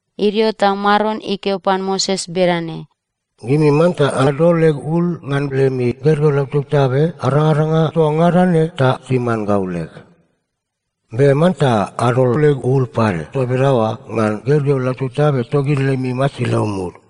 Idio ta Maron ikeo pan Moses bedane, “Gimi manta adol leg ul ngan lemi gergeu lautabtabe arangaranga toa ngada ne ta timan gau leg. Be manta adol leg ul pade toa bedaoa ngan gergeu lautabtabe togid lemi masilau mud.”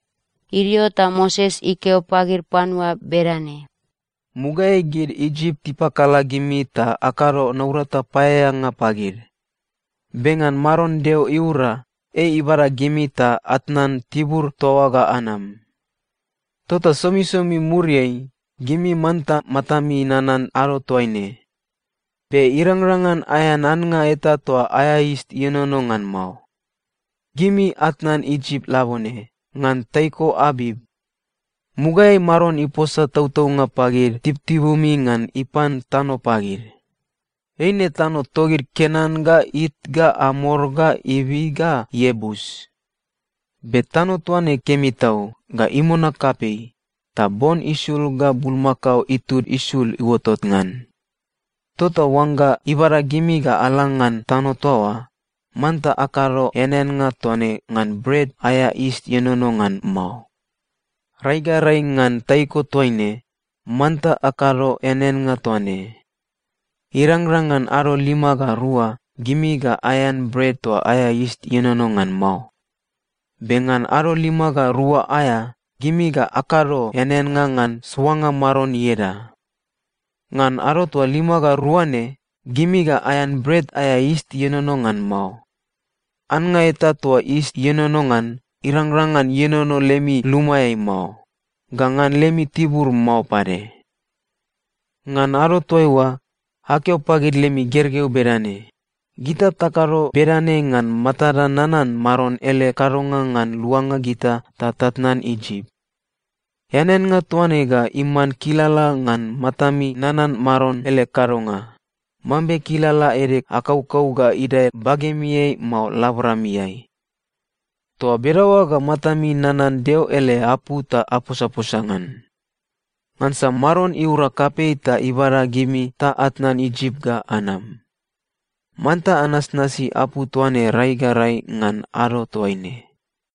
Idio ta Moses ikeo pagid panua bedane, “Mugaeai gid Isip tipakala gimi ta akado naurata paeaeanga pagid. Be ngan Maron Deo iura, ei ibada gimi ta atnan tibur toa oa ga anam. Tota somisomi muriai, gimi manta matami nanan ado toaine. Be irangrang ngan aean annga eta toa aea yis ienono ngan mao. Gimi atnan Isip labone, ngan taiko Abip. Mugaeai Maron iposa tautaunga pagid tibutibumi ngan ipan tano pagid. Eine tano togid Kenan ga It ga Amor ga Ivi ga Iebus. Be tano toa ne kemi tau ga imona kapei ta bon isul ga bulmakao itud isul iuotot ngan. Tota oangga ibada gimi ga ala ngan tano toa oa, manta akado eaneannga toa ne ngan Bret aea Yis Ienono ngan Mao. Rai ga rai ngan taiko toaine, manta akado eaneannga toa ne. Irangrang ngan ado lima ga rua, gimi ga aean bret toa aea yis ienono ngan mao. Be ngan ado lima ga rua aea, gimi ga akado eaneannga ngan soanga Maron ieda. Ngan ado toa lima ga rua ne, gimi ga aean bret aea yis ienono ngan mao. Annga eta toa yis ienono ngan, irangrang ngan ienono lemi lumaeai mao, ga ngan lemi tibur mao pade. Ngan ado toaiua, akeo pagid lemi gergeu bedane, ‘Gita takado bedane ngansa matada nanan Maron ele kadonga ngan luanga gita ta tatnan Isip.’ Eaneannga toa ne ga iman kilala ngan matami nanan Maron ele kadonga, mambe kilala ede akaukau ga idae bagemiai mao laboramiai. Toa bedaoa ga matami nanan Deo ele apu ta aposaposa ngan. Ngansa Maron iura kapei ta ibada gimi ta atnan Isip ga anam. Manta anasnasi apu toa ne rai ga rai ngan ado toaine.”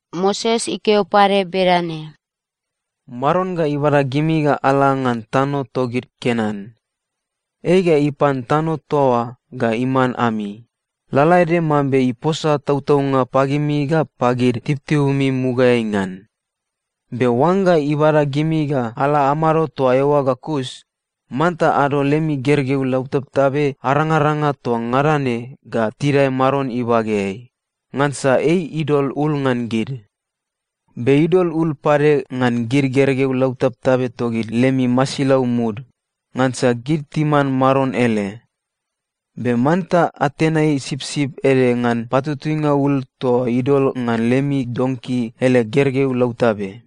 Moses ikeo pade bedane, “Maron ga ibada gimi ga ala ngan tano togid Kenan. Ei ga ipan tano toa oa ga iman ami, lalaede mambe iposa tautaunga pagimi ga pagid tibutibumi mugaeai ngan. Be oangga ibada gimi ga ala amado toa eoa ga kus, manta adol lemi gergeu lautabtabe arangaranga toa ngada ne ga tidae Maron ibageai, ngansa ei idol ul ngan gid. Be idol ul pade ngan gid gergeu lautabtabe togid lemi masilau mud, ngansa gid timan Maron ele. Be manta atenai sipsip ede ngan patutuinga ul toa idol ngan lemi donki ele gergeu lautabe.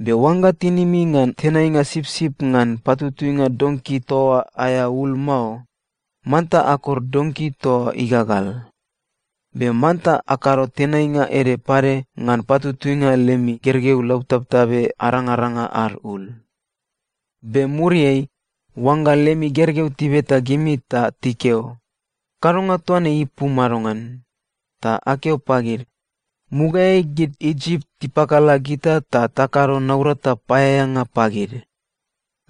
Be oangga tinimi ngan tenainga sipsip ngan patutuinga donki toa oa aea ul mao, manta akor donki toa oa igagal. Be manta akado tenainga ede pade ngan patutuinga lemi gergeu lautabtabe arangaranga ad ul. “Be muriai, oangga lemi gergeu tibeta gimi ta tikeo, ‘Kadonga toa ne ipu madongan?’ ta akeo pagid, ‘Mugaeai gid Isip tipakala gita ta takado naurata paeaeanga pagid.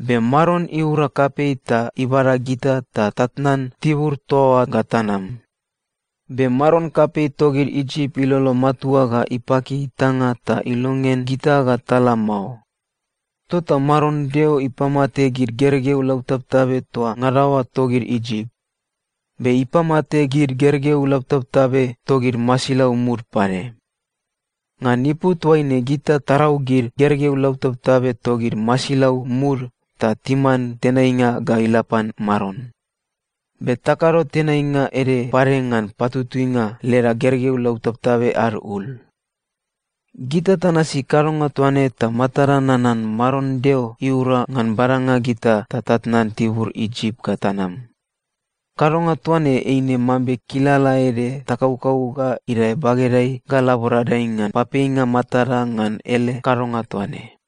Be Maron iura kapei ta ibada gita ta tatnan tibur toa oa ga tanam. Be maron kapei togid Isip ilolo matua ga ipaki itanga ta ilongean gita ga tala mao, tota Maron Deo ipamate gid gergeu lautabtabe toa ngada oa togid Isip. Be ipamate gid gergeu lautabtabe togid masilau mud pade. Ngan ipu toaine gita tarau gid gergeu lautabtabe togid masilau mud ta timan tenainga ga ila pan Maron. Be takado tenainga ede pade ngan patutuinga leda gergeu lautabtabe ad ul. Gita tanasi kadonga toa ne ta matada nanan Maron Deo iura ngan badanga gita ta tatnan tibur Isip ga tanam. Kadonga toa ne eine mambe kilala ede takaukau ga idae bagedai ga laboradai ngan papeinga matada ngan ele kadonga toa ne.’”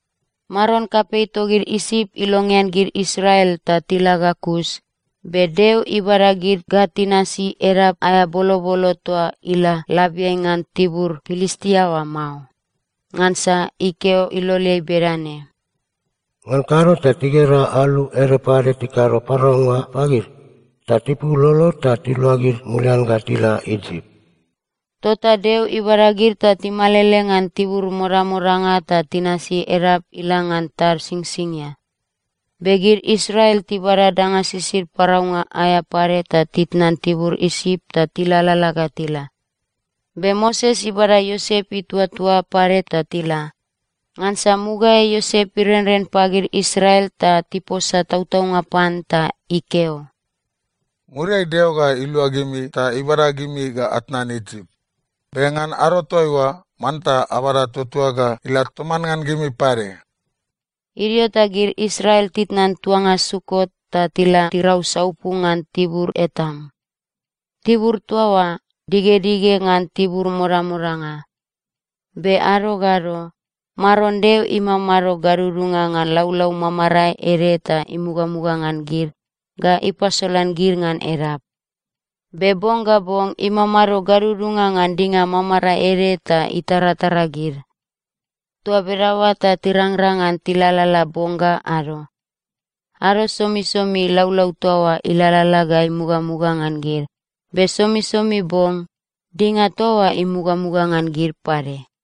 Maron kapei togid Isip ilongean gid Israel ta tila ga kus, be Deo ibada gid ga tinasi edap aea bolobolo toa ila labiai ngan tibur Pilistia oa mao. Ngansa ikeo iloleai bedane, “Ngan kado ta tigera alu ede pade tikado paraunga pagid, ta tipul lolod ta tiluagid mulian ga tila Isip.” Tota Deo ibada gid ta timalele ngan tibur modamodanga ta tinasi edap ila ngan tad Singsingia. Be gid Israel tibada danga sisid paraunga aea pade ta titnan tibur Isip ta tilalala ga tila. Be Moses ibada Iosep ituatua pade ta tila, ngansa mugaeai Iosep irenren pagid Israel ta tiposa tautaunga pan, ta ikeo, “Muriai Deo ga ilua gimi ta ibada gimi ga atnan Isip. Be ngan ado toaiua, manta abada tuatuag ga ila toman ngan gimi pade.” Idio ta gid Israel titnan tuanga Sukot ta tila tirau saupu ngan tibur Etam. Tibur toa oa digedige ngan tibur modamodanga. Be ado ga ado, Maron Deo imamado gadudunga ngan laulau mamarae ede ta imugamuga ngan gid ga ipasolan gid ngan edap. Be bong ga bong imamado gadudunga ngan dinga mamarae ede ta itaratara gid. Toa bedaoa ta tirangrang ngan tilalala bong ga ado. Ado somisomi laulau toa oa ilalala ga imugamuga ngan gid, be somisomi bong, dinga toa oa imugamuga ngan gid pade.